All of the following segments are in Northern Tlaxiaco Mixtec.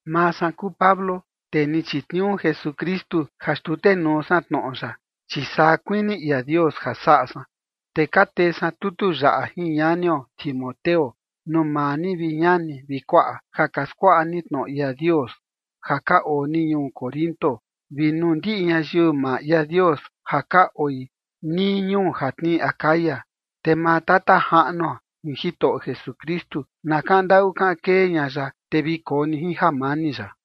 Maa san kuu Pablo, tee ni chitniuu Jesukristu ja xtutenuu san tnoꞌo ya, chi saa kuini ia Dios ja saꞌa san. Te ka tee san tutu yaꞌa jin ñanio Timoteo nuu maa ni, vi ñani vi kuaꞌa, ja ka skuaꞌa ni tnoꞌo ia Dios ja ka oo ni ñuu Corinto, vi nuu ndiꞌi ñayiu maa ia Dios ja ka oi nii ñuu ja tnii Acaya. Te maa Tata Jaꞌnuo jin Jitoꞌo Jesukristu na kaꞌan ndaꞌu kaꞌan kee ña ya, te vi koo ni jin jamani ya.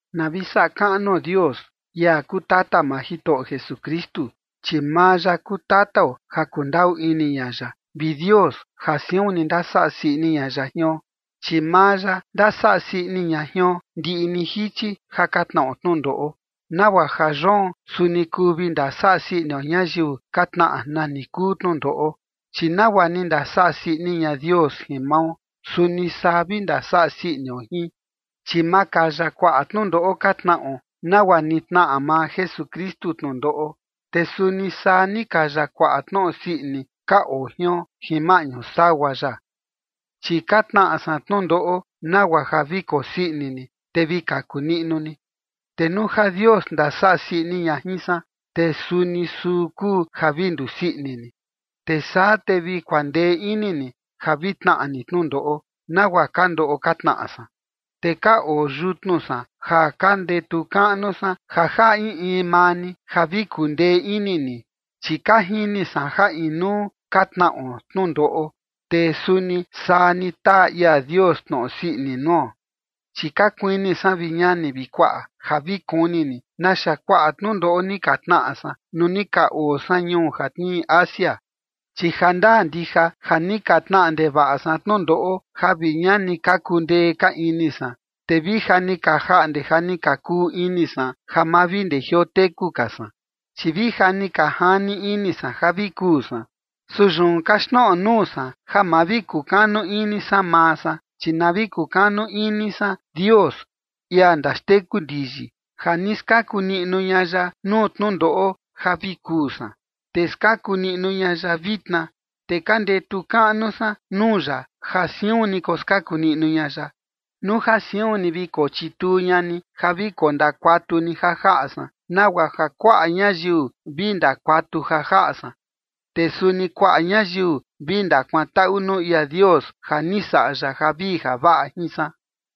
Na vi saꞌa kaꞌnuo Dios, ia kuu tata maa Jitoꞌo Jesukristu. Chi maa ya kuu tatao ja kundaꞌu ini ña ya, vi Dios ja siun ni ndasaꞌa sii ini ña ya jion. Chi maa ya ndasaꞌa sii ini ña jion ndiꞌi ni jichi ja ka tnaꞌo tnundoꞌo, nagua ja yoon, suni kuu vi ndasaꞌa sii inio ñayiu ka tnaꞌa nani kuu tnundoꞌo. Chi nagua ni ndasaꞌa sii ini ña Dios jin mao, suni saa vi ndasaꞌa sii inio jin. Chi makaya kuaꞌa tnundoꞌo ka tnaꞌo nagua ni tnaꞌa maa Jesukristu tnundoꞌo, te suni saa ni kaya kuaꞌa tnoꞌo sii ini ka oo jion jin maꞌñu sagua ya. Chi ka tnaꞌa san tnundoꞌo nagua ja vi kosii ini ni, te vi kaku niꞌnu ni. Te nuu ja Dios ndasaꞌa sii ini ña jin san, te suni suu kuu ja vi ndusii ini ni, te saa te vi kuandee ini ni ja vi tnaꞌa ni tnundoꞌo, nagua ka ndoꞌo ka tnaꞌa san. Te ka oo yutnu san ja ka ndetu kaꞌnu san ja jaꞌa in in maa ni ja vi kuandee ini ni, chi ka jini san ja inuu ka tnaꞌo tnundoꞌo, te suni saa ni taa ia Dios tnoꞌo sii ini nuo. Chi ka kuini san, vi ñani vi kuaꞌa, ja vi kuni ni naxa kuaꞌa tnundoꞌo ni ka tnaꞌa san nuu ni ka oo san ñuu ja tnii Asia, chi jandaa ndija ja ni ka tnaꞌa ndevaꞌa san tnundoꞌo ja vi ña ni kaku ndee ka ini san, te vi ja ni ka jaꞌnde ja ni ka kuu ini san ja ma vi ndejioo teku ka san. Chi vi ja ni ka jani ini san ja vi kuu san. Su yun kaxtnoꞌo nuu san ja ma vi kukanu ini san maa san, chi na vi kukanu ini san Dios, ia ndaxteku ndiyi, ja ni skaku niꞌnu ña ya nuu tnundoꞌo ja vi kuu san, te skaku niꞌnu ña ya vitna. Te ka ndetu kaꞌnu san nuu ya ja siun ni koskaku niꞌnu ña ya, nuu ja suni vi kochituu ña ni ja vi kondakuatu ni ja jaꞌa san, nagua ja kuaꞌa ñayiu vi ndakuatu ja jaꞌa san, te suni kuaꞌa ñayiu vi ndakuantaꞌu nuu ia Dios ja ni saꞌa ya javii javaꞌa jin san.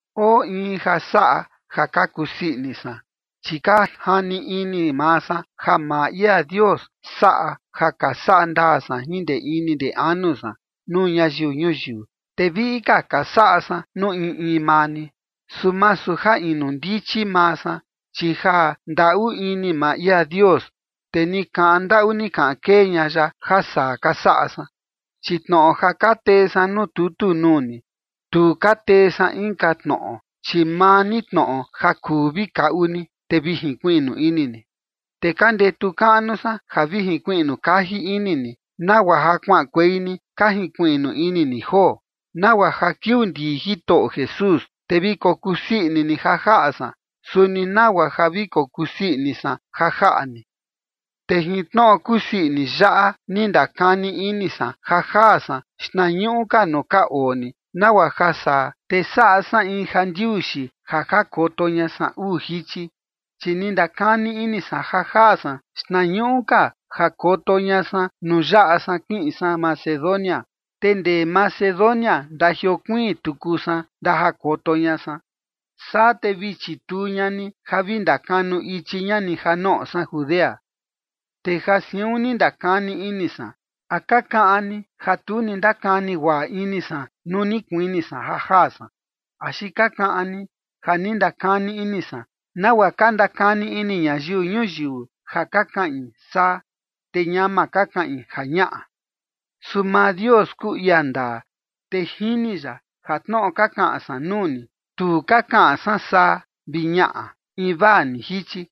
Oo in ja saꞌa ja ka kusii ini san, chi ka jani ini maa san ja maa ia Dios saꞌa ja ka saꞌa ndaa san jin ndee ini ndee anu san nuu ñayiu ñuyiu, te viꞌi ka ka saꞌa san nuu in in maa ni, su masu ja inu ndichi maa san, chi jandaꞌu ini maa ia Dios, te ni kaꞌan ndaꞌu ni kaꞌan kee ña ya ja saa ka saꞌa san. Chi tnoꞌo ja ka tee san nuu tutu nuu ni, tu ka tee san inka tnoꞌo, chi maa ni tnoꞌo ja kuu vi kaꞌu ni, te vi jinkuiꞌnu ini ni. Te ka ndetu kaꞌnu san ja vi jinkuiꞌnu kaji ini ni, nagua ja kuaꞌankuei ni ka jinkuiꞌnu ini ni joo, nagua ja kiuu ndii Jitoꞌo Jesús, te vi kokusii ini ni ja jaꞌa san, suni nagua ja vi kokusii ini san ja jaꞌa ni. Te jin tnoꞌo kusii ini yaꞌa, ni ndakani ini san ja jaa san xtnañuꞌu ka nuu ka oo ni, nagua ja saa, te saꞌa san in jandiuxi ja jakoto ña san uu jichi. Chi ni ndakani ini san ja jaa san xtnañuꞌu ka jakoto ña san nuu yaꞌa san ja kiꞌin san Macedonia, te ndee Macedonia ndajiokuiin tuku san ndajakoto ña san. Saa te vi chituu ña ni ja vi ndakanu ichi ña ni ja noꞌo san Judea. Te ja siun ni ndakani ini san, ¿a ka kaꞌan ni ja tu ni ndakani guaꞌa ini san nuu ni kuini san ja jaa san, axi ka kaꞌan ni ja ndakani ini san nagua ka ndakani ini ñayiu ñuyiu ja ka kaꞌin “saa” te ñama ka kaꞌin “ja ñaꞌa”? Su maa Dios kuu ia ndaa, te jini ya ja tnoꞌo ka kaꞌan san nuu ni, tu ka kaꞌan san “saa” vi “ñaꞌa” invaa ni jichi.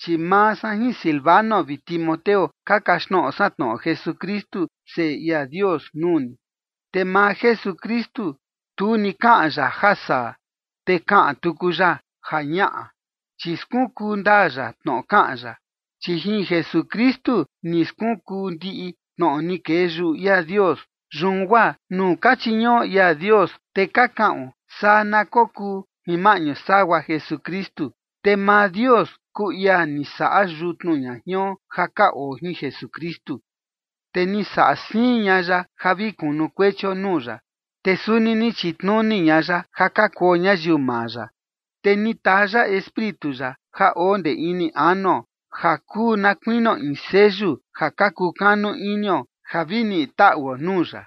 Chi maa san jin Silvano vi Timoteo ka kaxtnoꞌo san tnoꞌo Jesukristu, Seꞌe ia Dios, nuu ni. Te maa Jesukristu, tu ni kaꞌan ya “ja saa” te kaꞌan tuku ya “ja ñaꞌa”, chi skunkuu ndaa ya tnoꞌo kaꞌan ya. Chi jin Jesukristu ni skunkuu ndiꞌi tnoꞌo ni kee yuꞌu ia Dios, yun guaa nuu ka chiñuꞌo ia Dios, te ka kaꞌon “saa na kokuu” jin maꞌñu sagua Jesukristu. Te maa Dios kuu ia ni saꞌa yutnu ña jion ja ka oo jin Jesukristu, te ni saꞌa siin ña ya ja vi kunukuechio nuu ya. Te suni ni chitnuni ña ya ja ka kuo ñayiu maa ya, te ni taa ya Espíritu ya ja oo ndee ini anuo ja kuu na kuinio in seyu ja ka kukanu inio ja vi niꞌi taꞌuo nuu ya.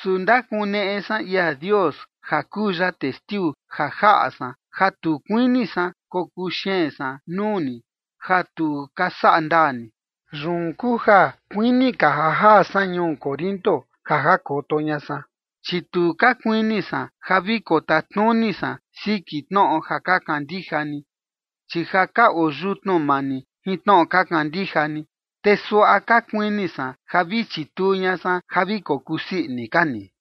Su ndakuneꞌe san ia Dios ja kuu ya testiu ja jaꞌa san ja tu kuini san kokuu xeen san nuu ni ja tu ka saꞌa ndaa ni. Yun kuu ja kuini ka ja jaa san ñuu Corinto ja jakoto ña san. Chi tu ka kuini san ja vi kotatnuni san siki tnoꞌo ja ka kandija ni, chi ja ka oo yutnu maa ni jin tnoꞌo ka kandija ni, te suaꞌa ka kuini san ja vi chituu ña san ja vi kokusii ini ka ni.